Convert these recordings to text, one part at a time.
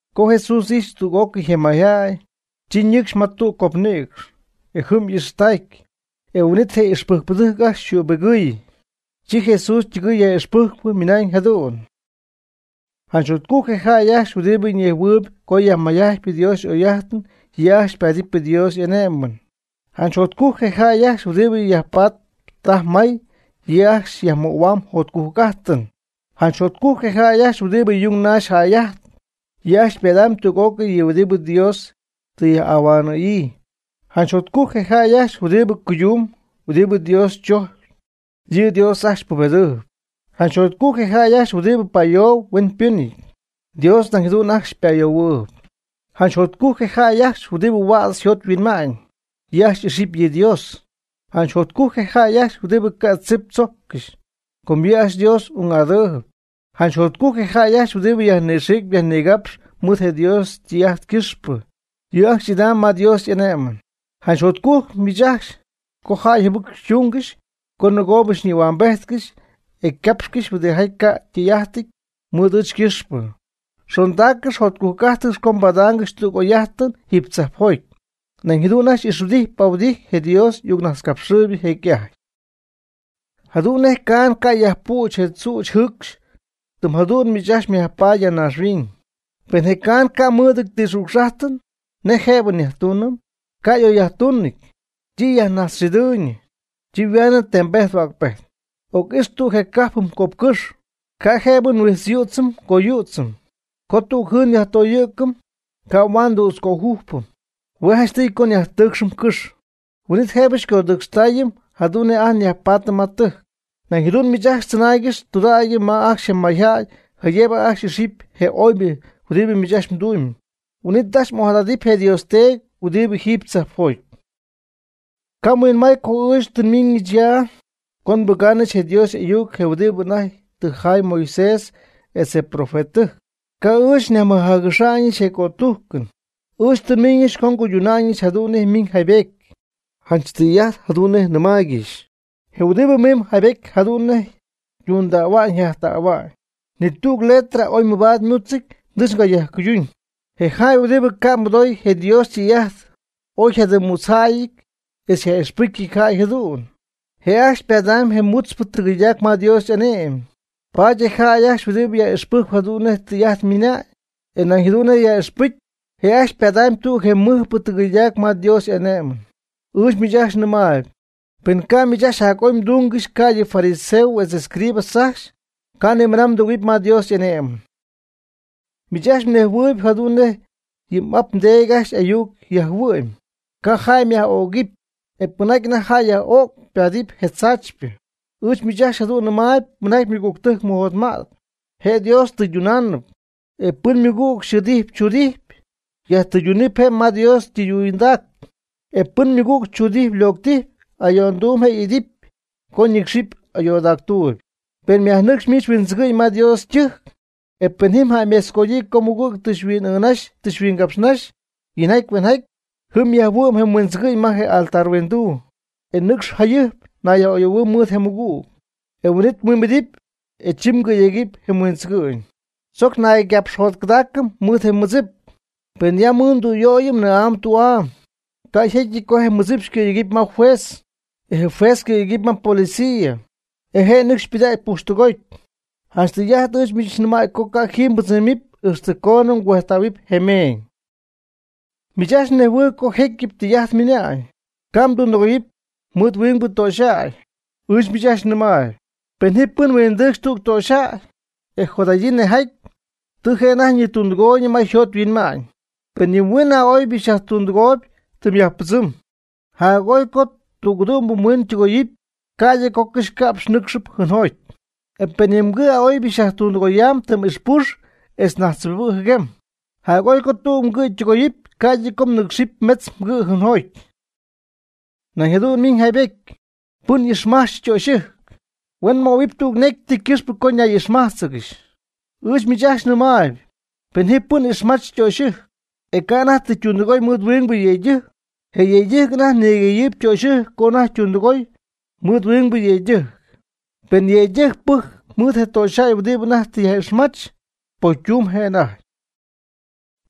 Co Jesús ijxy tüg'ócɨy je mayjäy, chi nɨcxy ma tüg copnïcx, e chi jɨm y'ixtacy. E huin'it je' y'ixpɨjcpɨdɨjc ajcxy yjübigɨɨy. Chi Jesús ytɨgɨɨy yaj'ixpɨjcp ymɨnañ jadu'n: ―Janch jotcujc je jäy ajcxy huɨdibɨ nejhuɨɨyb co yajmayjajtpy Dios y'oy'ajt, yɨ' ajcxy paatɨp Dios y'ane'mɨn. Janch jotcujc je jäy ajcxy huɨdi yajpatp taj may, yɨ' ajcxy yajmöhuam jotcujc'ajtɨn. Janch jotcujc je jäy ajcxy huɨdibɨ yung naxpy jäy'ajtp, yɨ' ajcxy padaamb tüg'ócɨy je huɨdi Dios tɨ yaj'ahuanɨ̈yii. Janch jotcujc je jäy ajcxy huɨdibɨ cuydunamb huɨdibɨ Dios chojcpy, Dios yɨ' ajcxy pubedɨɨb. Janch jotcujc je jäy ajcxy huɨdibɨ pa'ayoob huenytimpɨnjäyɨty, Dios nañ jadu'n ajcxy pa'ayohuɨɨb. Janch jotcujc je jäy ajcxy huɨdibɨ huädz yjot yhuinma'ñ, yɨ' ajcxy y'ixɨpy yɨ Dios. Janch jotcujc je jäy ajcxy huɨdibɨ ca' ti tzip tzojccɨxy, com yɨ' ajcxy Dios ung'adɨɨb. Janch jotcujc je jäy ajcxy huɨdibɨ yajnixiicp yajnigapxp mɨɨd je Dios ytɨy'ajt ycɨxpɨ. Yɨ' ajcxy idamb ma Dios y'ane'mɨn. Janch jotcujc miich ajcxy co jäy jɨbɨc xytungɨxy co nɨgoob xyñïhuambejtcɨxy etz capxcɨxy huɨdijaty ca' ytɨy'ajtɨty mɨɨd ɨɨch ycɨxpɨ. Xondaaccɨx jotcuj'ajtcɨx co mbadaangɨxy tüg oy'ajtɨn jiiby tzajpjoty. Nañ jadu'n ajcxy ixhuɨdijty pahuɨdijty je Dios y'ayucnajtzcapxɨɨybɨ jecy'ajty. Jadu'n nej caan ca' yajpüch je tzüch jɨɨcxy tɨm jadu'n miich ajcxy myajpaady ya naaxhuiñ. Pen je caan ca' mɨɨd ti xücx'ajtɨn, ¿nej jëbɨ nyajtuunɨm? Ca' y'oc'oyyajtunɨty, chi yajnajtzxɨdɨɨyñɨ, chi yhuaanɨ tembejt hua'cpejt. Oc'ix tüg je cajp jɨm copcɨx, ca' jëbɨ mhuijtzyüdzɨm mgoyüdzɨm. Co tüg jɨɨn nyajtoyɨ̈cɨm, ca' huaad tu'tz ngöjujpɨm. Hue janchtɨy co nyajtɨɨcxɨm cɨx, huin'it jëbɨ xycodɨcxtaayɨm jadu'n nej ajt nyajpaatɨm ma tɨjc. Nañ jadu'n miich ajcxy mdzɨnaaygɨxy tudägy ma ajcxy je mayjäy jaydëbɨ ajcxy ixipy je oybɨ huidi miich ajcxy mdumyb. Huin'it ajcxy ojadadɨpy je mDios teedy huɨdibɨ jiiby tzajpjoty. Ca' mhuinmay co ɨɨch tɨ nmiñɨch ya co nbɨgaanɨch je Dios y'ayuc je' huɨdibɨ anajty tɨ jaay Moisés etz je profetɨtɨjc. Ca' ɨɨch nyajmɨjaagɨxa'ñ je cötujcɨn, ɨɨch tɨ nmiñɨch co nguyduna'ñɨch jadu'n nej ymiñ jaaybety. Janch tɨy'ajt jadu'n nej nɨmaaygɨxy, je huɨdibɨ mimb jaaybety jadu'n tundähuam jajtähuam. Ni tüg letra oy mabaad ymúdzɨty nɨcxy ycayajcuyduñ. Je jäy huɨdibɨ ca' nimɨdooy je Dios ytɨy'ajt oy yjadɨm mutzjaty etz yaj'ixpɨcy jäy jadu'n, je' ajcxy padamb je mutzpɨ tɨgɨydac ma Dios y'ane'mɨn. Paady je jäy huɨdibɨ yaj'ixpɨjcp jadu'n nej tɨy'ajt ymɨna'ñ, e paduñ jadu'n nej yaj'ixpɨcy, je' ajcxy padamb tüg je mɨjpɨ tɨgɨydac ma Dios y'ane'mɨn. Ɨɨch miich ajcxy nɨmaayb, pen ca' miich ajcxy jac'oy mdúngɨxy ca'ydɨ fariseos etz escribas ajcxy, ca' nimɨna mdɨgɨ̈huɨpy ma Dios y'ane'mɨn. Miich ajcxy mnejhuɨɨygɨxy jadu'n nej yɨ m'ap mdeedy ajcxy ayuc yajhuɨ'my: “Ca' jäy myaj'ögɨp; e pɨn anajty jäy yaj'öcp ypaadɨp je tzaachypɨ.” Ɨɨch miich ajcxy jadu'n nɨmaayb pɨnjaty ymɨgügtɨjc mɨjotma'tp, je' Dios tɨydunaanɨpy; e pɨn ymɨgüg xɨɨdijp tzuudijp, yajtɨydunɨpy je' ma Dios tɨydundac; e pɨn ymɨgüg tzuudijp locɨdijp ayo'ndumb, je' y'ity co ñɨcxɨp ayoodactuuby. Pen myajnɨcxpy miich mhuindzɨgɨ'ñ ma Dios ytɨjc, e pen jɨm jäymetzgodyii co mmɨgüg tɨ xyhuin'ɨɨnnaxy tɨ xyhuincapxynaxy yinjaty hueenjaty, jɨm myajhuɨ'm je huindzɨgɨ'ñ ma je altar yhuinduu, e nɨcx jayɨjp nayyaj'oyɨ̈huɨɨ mɨɨd je mɨgüg, huin'it mhuimbedɨp e chɨmgɨ̈yecy je mhuindzɨgɨ'ñ. Tzojc naygapxjotcɨdägɨɨ mɨɨd je mɨdzip, pen yam mɨɨd tüyöy nɨɨ'am tü'am, ca' jecyɨty co je mɨdzip xycɨ̈yegɨp ma juez, e je juez xycɨ̈yegɨp ma je policia, e je' nɨcxy xypɨdägy pujxtɨgoty. Janch tɨy'ajt ɨɨch miich nɨmäy co ca' jiiby mbɨdzɨmɨpy ixtɨ coonɨ mgüejtähuɨpy je meeñ. Miich ajcxy mnejhuɨɨyb co jecyɨp tɨy'ajt ymɨna'ñ: “Ca' mmɨdundɨgoyɨpy huingbɨ töxyjäy.” Ɨɨch miich ajcxy nɨmaayb, pen ji pɨn huindɨcxy tüg töxyjäy, e jot'adɨɨyb nejjaty, tɨ je' anajty ñitundɨgooyñɨ ma yjot yhuinma'ñ. Pen yɨ mhuin a'oy'amybɨ xyajtundɨgoyamb tɨm yajpɨdzɨmb; jac'oy co tüg'ɨdu'mbɨ mhuin ytɨgoyɨpy ca'ydɨ co cɨxyca'px mnɨcxɨpy jɨɨnjoty. E pen yɨ mgɨ' a'oy'amybɨ xyajtundɨgoyamb tɨm ixpux etz najtzjibibɨ' jɨguem; jac'oy co tüg mgɨ' ytɨgoyɨpy ca'ydɨ co mmɨnɨcxɨpy metz mgɨ' jɨɨnjoty. Nañ jadu'n ymiñ jaaybety: “Pɨn ixmajtzp ytöxyɨjc, huen möhuɨpy tüg necy ti ycɨxpɨ co ñay'ixmájtzɨgɨxy.” Ɨɨch miich ajcxy nɨmaayb, pen ji pɨn ixmach ytöxyɨjc, e ca' anajty tɨ ytundɨgooy mɨɨd huingbɨ yëydɨjc, je yëydɨjc anajty nigɨydeyɨɨyb ytöxyɨjc co anajty ytundɨgooy mɨɨd huingbɨ yëydɨjc; pɨn yëydɨjc pɨjcp mɨɨd je töxyjäy huɨdibɨ anajty tɨ yaj'ixmach, pocytumyb je' anajty.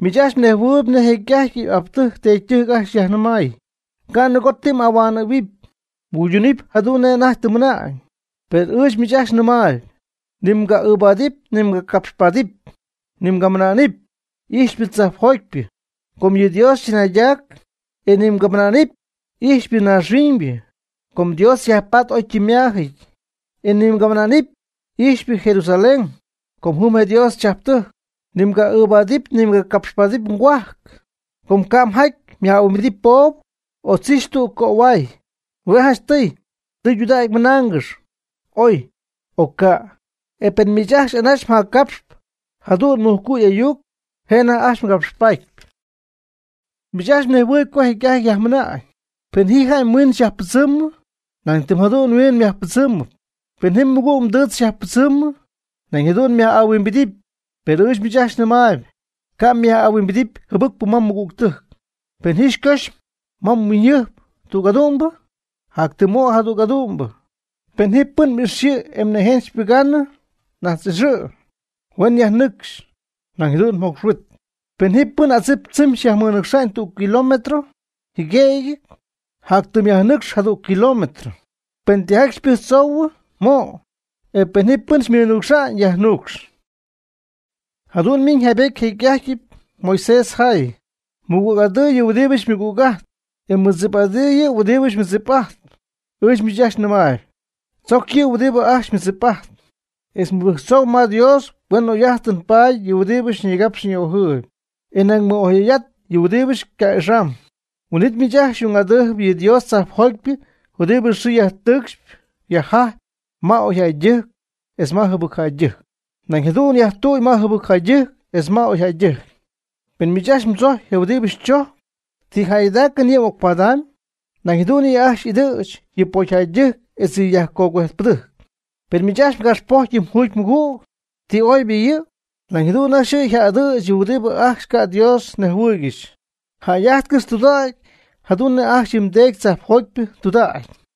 Miich ajcxy mnejhuɨɨyb nej jecy'ajty m'aptɨjc mdeedytɨjc ajcxy yajnɨmay: “Ca' nɨgo ti m'ahuanɨ̈huɨpy, mguydunɨpy jadu'n nej anajty tɨ mmɨna'ñ.” Per ɨɨch miich ajcxy nɨmaayb: ni mga'ɨɨbaadɨp ni mgacapxpaadɨp; ni mgamɨna'nɨp; “y'ijxpy tzajpjotypɨ,” com yɨ' Dios chɨnaydac. E ni mgamɨna'nɨp, “y'ijxpy naaxhuiñybɨ,” com Dios yajpatp oy ytɨmymaajɨty. E ni mgamɨna'nɨp; “y'ijxpy Jerusalén,” com jɨm je' Dios chajptɨjc; ni mga'ɨɨbaadɨp ni mgacapxpaadɨp mgohuajc, com ca' mjaty myaj'ahuimbity poob o tzixy tüg cöhuay. Hue' janchtɨy, tɨydudägy mɨnaangɨxy: “oy” o “ca'.” E pen miich ajcxy anaxy jaccapxp jadu'n mujcu' y'ayuc je' anajty ajcxy mgapxpy. Miich ajcxy mnejhuɨɨyb co jecy'ajty yajmɨnañ: “Pen ji jäy mhuiin xyajpɨdzɨmɨ, nañ tɨm jadu'n yhuiin myajpɨdzɨmɨpy; pen ji mɨgüg mdɨɨtz xyajpɨdzɨmɨ, nañ jadu'n myaj'ahuimbidɨpy.” Per ɨɨch miich ajcxy nɨmaayb: Ca' myaj'ahuimbidɨpy jɨbɨcpɨ ma mɨgügtɨjc; pen ji pɨn xycoxy ma mhuiñyjɨjp tüg adu'mbɨ, jac tɨm mo' jadüg adu'm'amybɨ. Pen ji pɨn xyxɨ̈y e xypɨgaanɨ yɨ mnïjen, najtz'ixɨ', huen xyajnɨcxɨ nañ jadu'n mjocx huit. Pen ji pɨn adzip tzɨmy xyajmɨnɨcxa'ñ tüg kilómetro jɨguemɨty, yajnɨcx jac tɨm jadüg kilómetro. Pen tijaty xypɨjctzoohuɨ, mo'. E pen ji pɨn xymɨnuucxa'ñ, yajnuucx. Jadu'n ymiñ jaaybety nej jecyɨp Moisés yjay: “Mɨgüg'adɨɨ yɨ' huɨdibɨ xymɨgüg'ajtp, e mɨdzip'adɨɨ yɨ' huɨdibɨ xymɨdzip'ajtp.” Ɨɨch miich ajcxy nɨmaayb: Tzoc yɨ' huɨdibɨ ajcxy xymɨdzip'ajtp, etz mɨbɨjctzoohuɨ ma Dios huen y'oy'ajtɨn paady yɨ huɨdibɨ xyñigapx xyni'ojɨɨyb, e nañ mɨ'oyjäy'at yɨ huɨdibɨ xyca'ixamb. Huin'it miich ajcxy xy'ung'adɨɨby yɨ Dios tzajpjotypɨ huɨdibɨ yxɨɨ yajtɨɨcxp yajjajp ma oyjäydɨjc etz ma jɨbɨcjäydɨjc, nañ jadu'n yajtüy ma jɨbɨcjäydɨjc etz ma oyjäydɨjc. Pen miich ajcxy mdzojcpy je huɨdibɨ xychojcp, ¿ti jäygɨdaacɨn yɨ' m'ocpadamyb? Nañ jadu'n yɨ' ajcxy yja'ɨdɨɨtzp yɨ pocyjäydɨjc etz yɨ yajcogüejtpɨdɨjc. Pen miich ajcxy mgapxpocxyp yɨ mjugymɨgüg, ¿ti oybɨ yɨ'? Nañ jadu'n ajcxy yɨ' yja'ɨdɨɨtzp yɨ huɨdibɨ ajcxy ca' Dios nejhuɨɨygɨxy. Jäy'ajtcɨx tudägy jadu'n nej ajcxy yɨ mdeedy tzajpjotypɨ ytudägy.